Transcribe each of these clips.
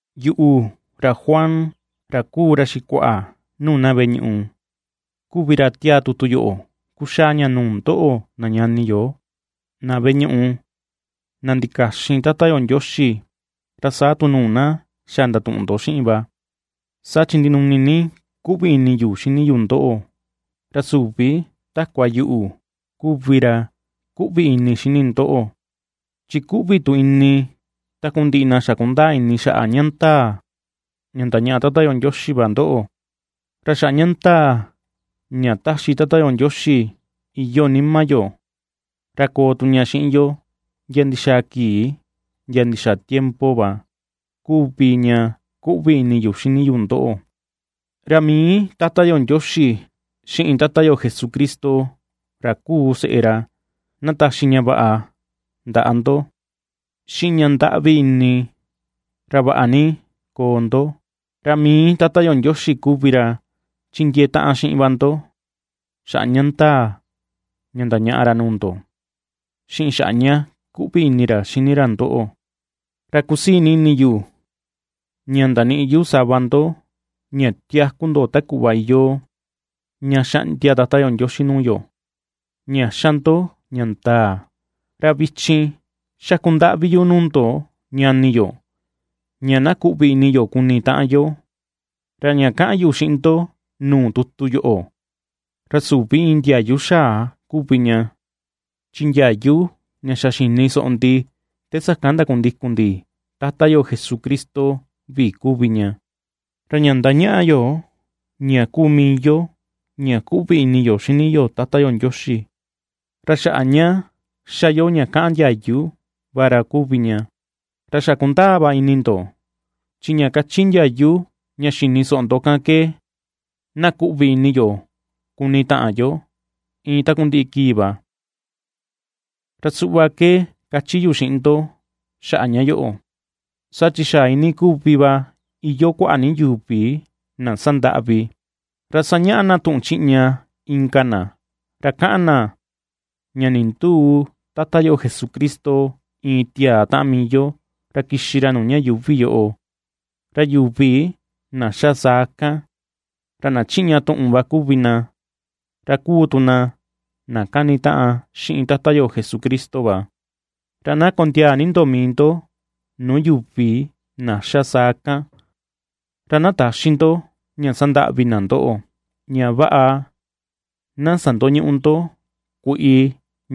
Yuꞌu, ra Juan, ra kuu ra xikuaꞌa nuu na veꞌe ñuꞌu kuvi ra tiaa tutu yoꞌo kuxaa ña nuu ndoꞌo na ñani yo, na veꞌe ñuꞌu na ndikaxin Tata yo Ndioxi, ra saa tu nuu na xa ndatuꞌun ndo xiꞌin va, saa chi ndinuni ni kuꞌvi ini yu xini yu ndoꞌo, ra süvi takua yuꞌu kuvi ra kuꞌvi ini xini ndoꞌo, chi kuꞌvi tu ini takundiꞌi na xa kundaa ini xaꞌa ña ndaa ña ndañaꞌa Tata yo Ndioxi va ndoꞌo. Ra xaꞌa ña ndaa ña ^taxi Tata yo Ndioxi iyoo nima yo, ra koo tu ña xiꞌin yo ndia ndixaa kii ndia ndixaa tiempo va kuvi ña kuꞌvi ini yu xini yu ndoꞌo. Ra mii Tata yo Ndioxi, xiꞌin Tata yo Jesucristo, ra kuu seꞌe ra, na taxi ña vaꞌa ndaꞌa ndo, xiꞌin ña ndaꞌvi ini, ra vaꞌa ni koo ndo, ra mii Tata yo Ndioxi kuvi ra chindiee taꞌan xiꞌin va ndo, xaꞌa ña ndaa ña ndañaꞌa ra nuu ndo, xiꞌin xaꞌa ña kuꞌvi ini ra xini ra ndoꞌo. Ra kusii ni ini yu ña ndaniꞌi yu sava ndo ña tiaku ndo ta kuꞌva iyoo ña xaꞌndia Tata yo Ndioxi nuu yo ña xa ndo ña ndaa. Ra vichin, xaku ndaꞌvi yu nuu ndo ñani yo, ña na kuꞌvi ini yo kuni taꞌan yo. Ra ña kaꞌan yu xiꞌin ndo nuu tutu yoꞌo, ra süvi iin ndiayu xaa kuvi ña, chi ndiayu ña xa xini soꞌo ndi te sakan ndakundikun ndi Tata yo Jesucristo vi kuvi ña. Ra ña ^ndañaꞌa yo ña kuu mii yo ña kuꞌvi ini yo xini yo Tata yo Ndioxi, ra xaꞌa ña ^xa yo ña kaꞌan ndiayu va ra kuvi ña; ra xa kundaa va ini ndo, chi ña kachi ndiayu ña xini soꞌo ndo kan ke: na kuꞌvi ini yo kuni taꞌan yo iin takundiꞌi kii va. Ra suꞌva ke kachi yu xiꞌin ndo xaꞌa ña yoꞌo, saa chi xa iinii kuvi va iyoo kuaꞌa ni yuvi na sandaꞌvi, ra sañaꞌa na tuꞌun chiꞌña inka na, ra kaꞌan na ña nindüu Tata yo Jesucristo iin tiaa taꞌan mii yo, ra kixi ra nuu ña yuuvi yoꞌo. Ra yuvi na xa saa kan, ra na chiꞌña tuꞌun va kuvi na, ra kuu tu na na ^kanitaꞌan xiꞌin Tata yo Jesucristo va. Ra na kondiaa ni ndo mii ndo nuu yuvi na xa saa kan, ra na täxi ndo ña sandaꞌvi na ndoꞌo, ña vaꞌa na sandoñüꞌu ndo kuiꞌi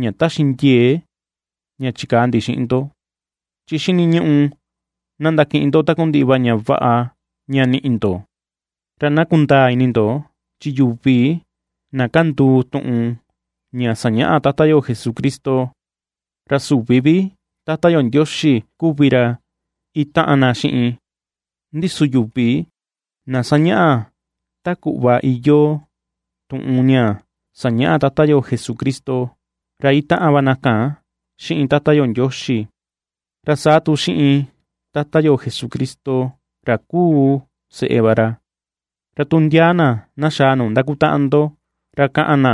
ña taxi ndiee ña chikaa ndi xiꞌin ndo, chi xiniñuꞌu na ndakiꞌin ndo takundiꞌi va ñaꞌa ña niꞌi ndo. Ra na kundaa ini ndo, chi yuvi na kanduu tuꞌun ña sañaꞌa Tata yo Jesucristo, ra süvi vi Tata yo Ndioxi kuvi ra itaꞌan na xiꞌin; ndi su yuvi na ^sañaꞌa ta kuꞌva iyoo tuꞌun ña sañaꞌa Tata yo Jesucristo, ra itaꞌan va na kan xiꞌin Tata yo Ndioxi, ra saa tu xiꞌin Tata yo Jesucristo, ra kuu seꞌe va ra. Ra tu ndia na na xaa nuu ndakutaꞌan ndo, ra kaꞌan na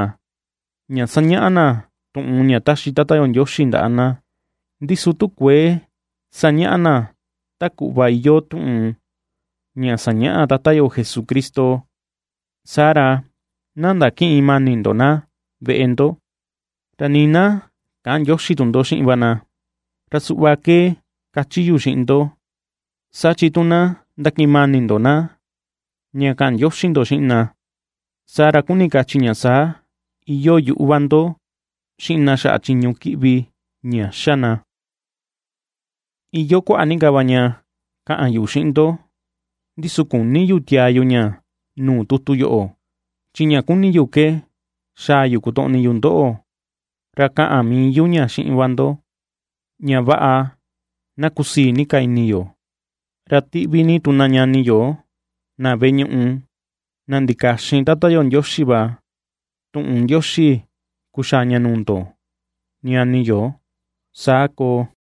ña sañaꞌa na tuꞌun ña ^taxi Tata yo Ndioxi ndaꞌa na, ndi su tu kuëe ^sañaꞌa na ta kuꞌva iyoo tuꞌun ña sañaꞌa Tata yo Jesucristo, saa ra na ndakïꞌin mani ndo na veꞌe ndo, ra nii na käꞌan ndioxi tu ndo xiꞌin va na; Ra suꞌva ke kachi yu xiꞌin ndo, saa chi tu na ndakiꞌin mani ndo na ña kaꞌan ndioxi ndo xiꞌin na, saa ra kuni kachi ña saa ña iyoo yuꞌu va ndo xiꞌin na xaꞌa chiñu kiꞌvi ña xa na. Iyoo kuaꞌa ni ka va ña kaꞌan yu xiꞌin ndo, ndi su küni yu tiaa yu ña nuu tutu yoꞌo; chi ña kuni yu ke xaa yu kotoꞌni yu ndoꞌo, ra kaꞌan mii yu ña xiꞌin va ndo, ña vaꞌa na kusii ni ka ini yo. Ra tiꞌvi ni tu na ñani yo na veꞌe ñuꞌu, na ndikaxin Tata yo Ndioxi va, tuꞌun ndioxi kuxaa ña nuu ndo ñani yo. Saa koo.